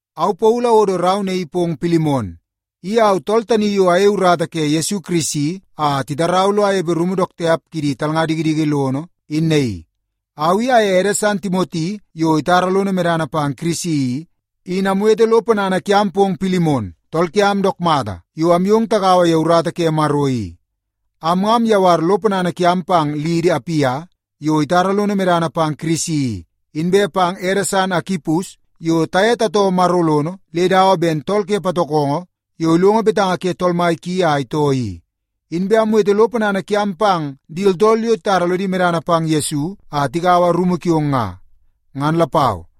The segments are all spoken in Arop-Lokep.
Au Paulu awodo rau naii pong Pilimon. I au tool tani yo ayei urata ke Yesu Kirisi a titarau lo anepe rumu dook tiap kidi talnga dikidiki lono in naii. Au i aye ede san Timoti yo itara lono medana pang Kirisi i, in amwete lo ponana kiam pong Pilimon, tool kiam dook mata yo amyong tagaua ye urata ke Maro i. Am nga amyawar lo ponana kiam pang liidi, Apia, yo itara lono medana pang Kirisi i, inbe pang ede san, Akipus, yo taye tatoo Maro lono le dawa ben tool ke patokongo yo ilongo betanga ke tool mai ki a itoo i. Inbe amwete lo ponana kiam pang di tooltool yo titara lodi medana pang Yesu a tigaua rumu kiong nga, ngan lapau.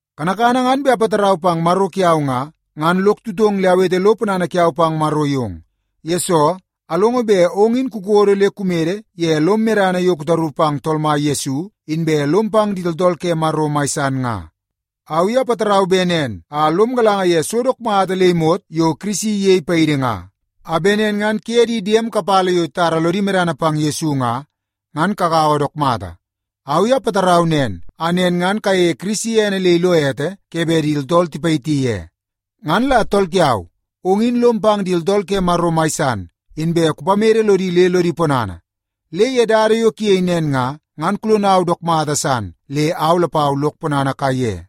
Kanakana ngan bet apatarau pang Maro kiau nga, ngan lok tutong le awete lo ponana kiau pang Maro yong. Yesoo, alongo bet ong in kukodo le kumede ye lom medana yo kutaru pang Tool Mai Yesu, inbe lom pang di tooltool ke Maro mai san nga. Au i apatarau bet nen a lom galanga ye so dook mata le imot yo Kirisi iyei paidi nga, a bet nen ngan kuye di diem kapala yo titara lodi medana pang Yesu nga, ngan kagaua dook mata. Au i apatarau nen a nen ngan kayeie Kirisi ene le ilo ete ke bet di tooltool tipayiti ye. Ngan la tool kiau, ong in lom pang di tooltool ke Maro mai san, inbe kupamede lodi le lodi ponana. Le ye dada yo kuyei nen nga, ngan kulonau dook mata san le au lapau lok ponana kaiye.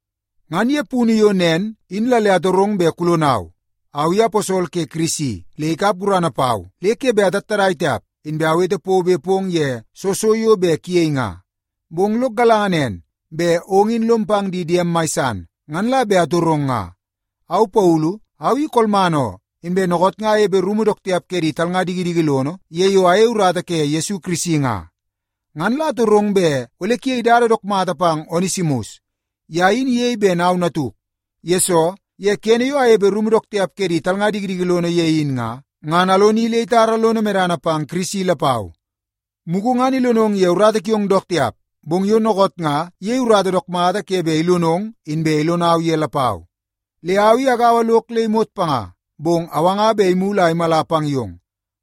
Ngan ye punu yo nen in la le atorong bet kulonau. Au i aposol ke Kirisi le ikap gurana pau le ke bet atattadai tiap, inbe awete pobe pong ye soo so yo bet kuyei nga. Bong lok galanga nen, bet ong in lom pang di diem mai san, ngan la bet atorong nga. Au Paulu, au i kolman oo, inbe dookoot nga anepe rumu dook tiap ke di talnga dikidiki lono ye yo ayei urata ke Yesu Kirisi nga. Ngan la atorong bet ole kuyei dada dook mata pang Onesimus. Ye in iyei ben au natuk, yesoo ye kene yo anepe rumu dook tiap ke di talnga dikidiki lono ye in nga, ngan aloni le itara lono medana pang Kirisi lapau. Mugu ngan ilonong ye urata kiong dook tiap, bong yo dookoot nga iyei urata dook mata ke bet ilonong inbe ilonau ye lapau. Le au i agaua lok le imot panga, bong awanga bet imulu a imala pang yong.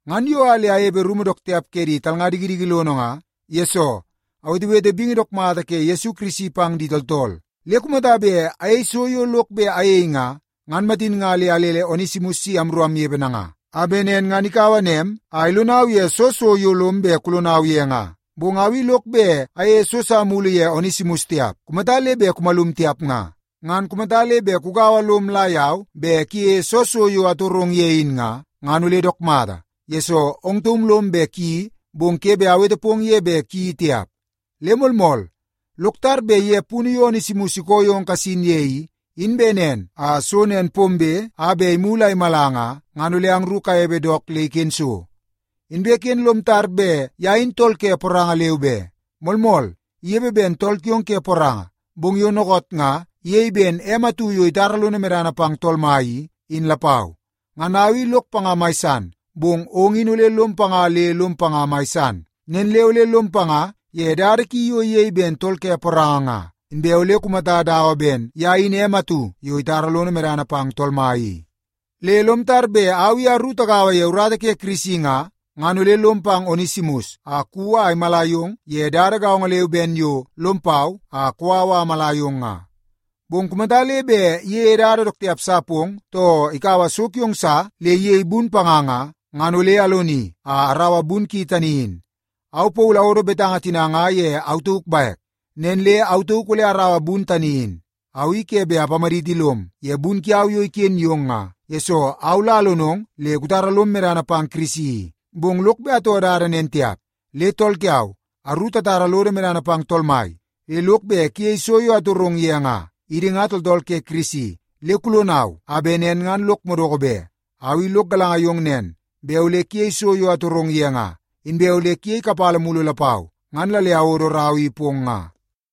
Ngan yo a le anepe rumu dook tiap ke di talnga dikidiki lono nga, yesoo awetewete bingi dook mata ke Yesu Kirisi pang di tooltool. Le kumata bet ayei so yo lok bet ayei nga, ngan matin nga le alele Onesimus si amru amnepe nanga, a bet nen ngan ikaua nem a ilonau ye soo so yo lom bet kulonau ye nga. Bong au i lok bet ayeie so sa mulu ye Onesimus tiap kumata le bet kumalum tiap nga. Ngan kumata le bet kugaua lom la yau bet kuyeie soo so yo atorong ye in nga, ngan ole dook mata, yesoo ong taum lom bet kuyeii, bong ke bet awete pong ye bet kuyeii tiap. Le moolmool, lok tar bet ye punu yo Onesimus ikoo yong kasin ye i, in bet nen a so nen pombe a bet imulu a imala nga, ngan ole angru kanepe dook le iken so. Inbe ken le lom tar bet ye in tool ke poranga leu be. Moolmool, inepe ben tool kiong ke poranga, bong yo dookoot nga iyei ben em atu yo itara lono medana pang Tool Mai i, in lapau. Ngan au i lok panga mai san, bong ong in ole lom panga le lom panga mai san. Nen le ole lom panga ye dada ki yo iyei ben tool ke poranga nga, inbe ole kumata dawa ben ye in em atu yo itara lono medana pang Tool Mai i. Le lom tar bet au i aru tagaua ye urata ke Kirisi nga, ngan ole lom pang Onesimus a kuwi a imala yong ye dada gaongo leu ben yo bet lom pau a kou au a amala yong nga. Bong kumata le bet iyeie dada dook tiap sa pong, too ikaua so kiong sa le iyei bun panga nga, ngan ole aloni a araua bun ki tani in. Au Paulu awodo betanga tina nga ye au tauk bek. Nen le au tauk ole araua bun tani in. Au i ke bet apamaditi lom ye bun kiau yo iken yong nga, yesoo au la alonong le kutara lom medana pang Kirisi i, bong lok bet atoo dada nen tiap. Le tool kiau, aru tatara lodo medana pang Tool Mai, le lok bet kuyei so yo atorong ye nga. Idi nga tooltool ke Kirisi, le kulonau a bet nen ngan lok madoko be. Au i lok galanga yong nen, bet ole kuyei so yo atorong ye nga, inbe ole kuyei kapala mulu lapau, ngan la le awodo rau i pong nga.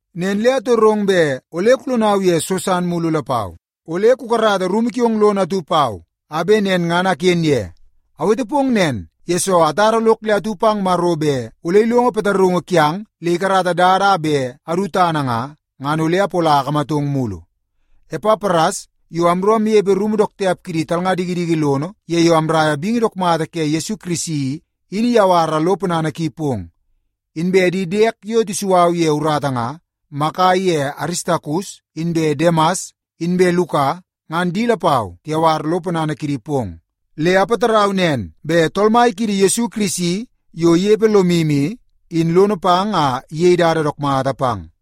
Nen le atorong bet ole kulonau ye so san mulu lapau. Ole kukarata rumu kiong lono atu pau a bet nen ngan aken ye. Awete pong nen, yesoo atara lok le atu pang Maro bet ole ilongo pataraungu kiang le ikarata dada a bet adu tana nga, ngan ole apola akamatang mulu. Epapras, yo amru amnepe rumu dook tiap kidi talnga dikidiki lono ye yo amraia bingi dook mata ke Yesu Kirisi i, in iyawara lo ponana ki pong. Inbe di diek yo tisu au ye urata nga, Maka iye Aristakus inbe Demas inbe Luka, ngan di lapau tiyawar lo ponana kidi pong. Le apatarau nen bet Tool Mai kiidi Yesu Kirisi yo inepe lomu i, in lono pang a iyei dada dook mata pang.